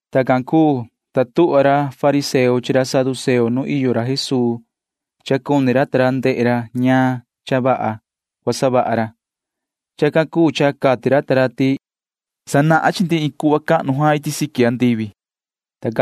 Tacan cuu, ta tuhva ra fariseo chi ra saduceo nu iyo ra Jesuu. Cuni ndehe ra ta ra a ña vaha cua savaha ra. Chacan cuu cha cati ra ta ra ti na cua sanahan ra iin cuhva cahnu iti siqui andivi chi ra ta ra,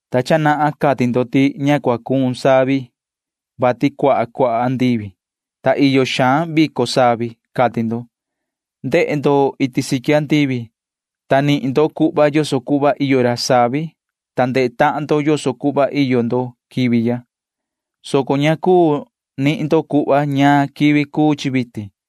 ta cha nahan cati ndo ti vitin cua cuun savi, vati cuaha cuaha iyo andivi, ta tava xaan ra savi vico, cati ndo. Ndehe ndo iti siqui andivi, ta nihin ndo cuhva yoso cuhva iyo ra savi, ta ndehe tahan ndo yoso cuhva iyo ndo quivi ya, soco ña cuu nihin ndo cuhva ñaan quivi cuu chi vitin.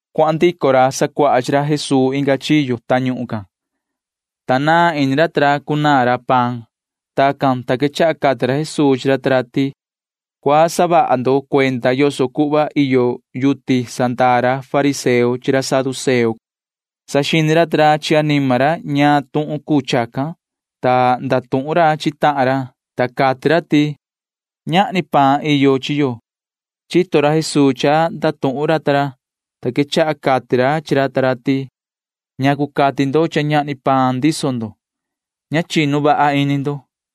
Cuahan ndico ra sacuaha chi ra Jesuu inga chiyo tañuhun can, ta naan ini ra ta ra cunaan ra paan. Tacan, ta quechaha cati ra Jesuu chi ra ta ra ti: ―Cua saha vaha ndo cuenda yoso cuhva iyo levadura ra fariseo chi ra saduceo ―cati ra. Saxini ra ta ra chi anima ra ñaan tuhun cuu chacan, ta ndatuhun ra chi tahan ra, ta cati ra ti: ―Ñahni paan iyo chi yo ―cati ra ta ra. Chito ra Jesuu cha ndatuhun ra ta ra, ta quechaha cati ra chi ra ta ra ti: ―¿Ñacu cha ndatuhun ndo chi tahan ndo ti ñahni paan ndiso ndo? Ña ta cuinu vaha ini ndo.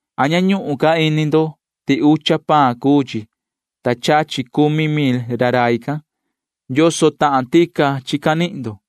Vasi ña ñuhun ca ini ndo ti ucha paan cuu chi, ta chachi cumi tahan mil ra rai can. ¿Yoso tahan ndoho chi canihin ndo?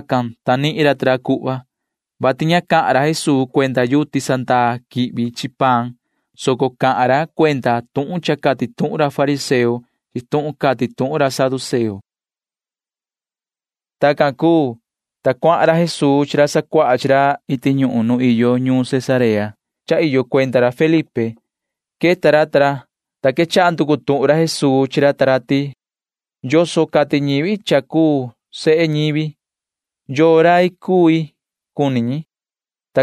Tacan, ta nihin ra ta ra cuhva, vati ña cahan ra Jesuu cuenda levadura quihvi paan, soco cahan ra cuenda tuhun cha cati tuhun ra fariseo chi tuhun cati tuhun ra saduceo. Tacan cuu, ta cuahan ra Jesuu chi ra sacuaha chi ra iti ñuhun nu iyo ñuun Cesarea cha iyo cuenda ra Felipe. Queta ra ta ra, ta quechaha nducu tuhun ra Jesuu chi ra ta ra ti: ―¿Yoso cati ñivi cuenda yuhu ra cuu sehe ñivi? ¿Yoo rai cui cuni ñi? ―cati ra.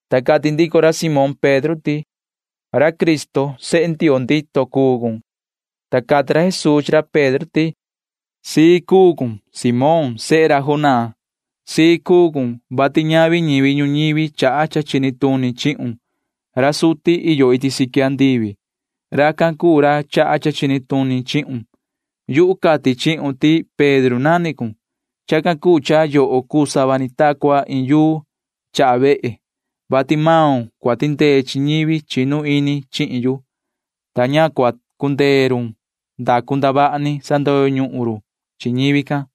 Ta cati ndico ra Simón Pedro ti: ―Ra Cristo ra cuu sehe Ndioo ndito cuu yoho ―cati ra. Ta cati ra Jesuu chi ra Pedro ti: ―Cua cusii ini cun, yoho Simón sehe Jonaa. Cua cusii ini cun, vati ñavi ñivi ñuñivi chaha cha chini tuni chihun. Ra suti iyo iti siqui andivi―racan cuu ra chaha cha chini tuni chihun. Yuhu cati chihun ti Pedro nani cun. Chacan cuu cha yoho cuu sava ni ta cua iin yuu [chaha vehe], vati maun cua tindee chi ñivi chinu ini chihin yu, ta ña cua cundee run ndacu ndavaha ni sandoyo ñuhun run chi ñivi can.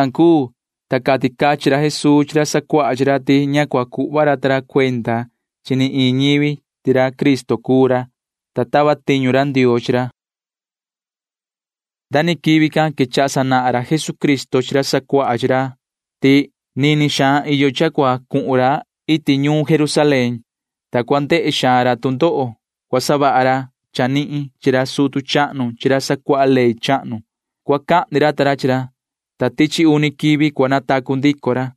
Tacan cuu, ta cati cachin ra Jesuu chi ra sacuaha chi ra ti ña cua cuhva ra ta ra cuenda chi ni iin ñivi ti ra Cristo cuu ra, [ta tava tiñu ra Ndioo chi ra]. Nda ni quivi can quechaha sanahan ra Jesucristo chi ra sacuaha chi ra ti nini xaan iyo cha cua cuhun ra iti ñuun Jerusalén, ta cua ndehe xaan ra tu ndoho cua savaha ra chanihin chi ra sutu chahnu chi ra sacuaha ley chahnu. Cua cahni ra ta ra chi ra, ta tichi uni quivi cua natacu ndico ra.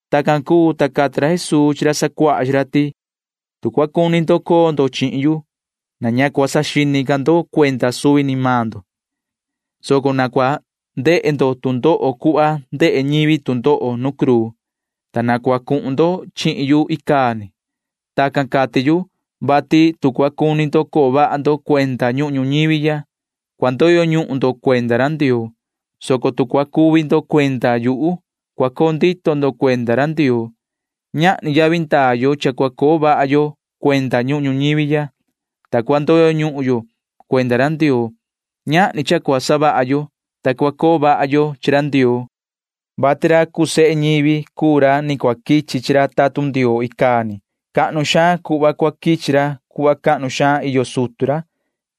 Tacan cuu, ta cati ra Jesuu chi ra sacuaha chi ra ti: ―Tu cua cuni ndo coo ndo chihin yu, na ña cua saxini ca ndo cuenda suvi ni maan ndo, soco na cua ndehe ndo tu ndoho cuhva ndehe ñivi tu ndoho nu cruu, ta na cua cuhun ndo chihin yu icaa ni. [Tacan cati yu,] vati tu cua cuni ndo coo vaha ndo cuenda ñuhun ñuñivi ya, cua ndoyo ñuhun ndo cuenda ra Ndioo, soco tu cua cuvi ndo cuenda yuhu, cua coo ndito ndo cuenda ra Ndioo. Ñahni yavi ndaa yo cha cua coo vaha yo cuenda ñuhun ñuñivi, ta cua ndoyo ñuhun yo cuenda ra Ndioo. Ñahni cha cua savaha yo, ta cua coo vaha yo chi ra Ndioo, vati ra cuu sehe ñivi cuu ra ni cua quichi chi ra tatun Ndioo icaa ni. Cahnu xaan cuhva cua quichi ra cuhva cahnu xaan iyo sutu ra.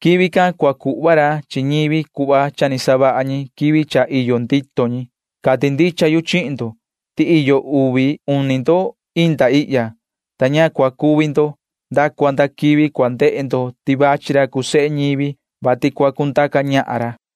Quivi can cua cuhva ra chi ñivi cuhva cha ni savaha ñi quivi cha iyo ndito ñi. Cati ndicha yu chihin ndo ti iyo uvi uni ndo inda ihya, ta ña cua cuvi ndo nda cua nda quivi cua ndehe ndo ti vachi ra cuu sehe ñivi, vati cua cundaca ñahan ra ―cati ra Jesuu.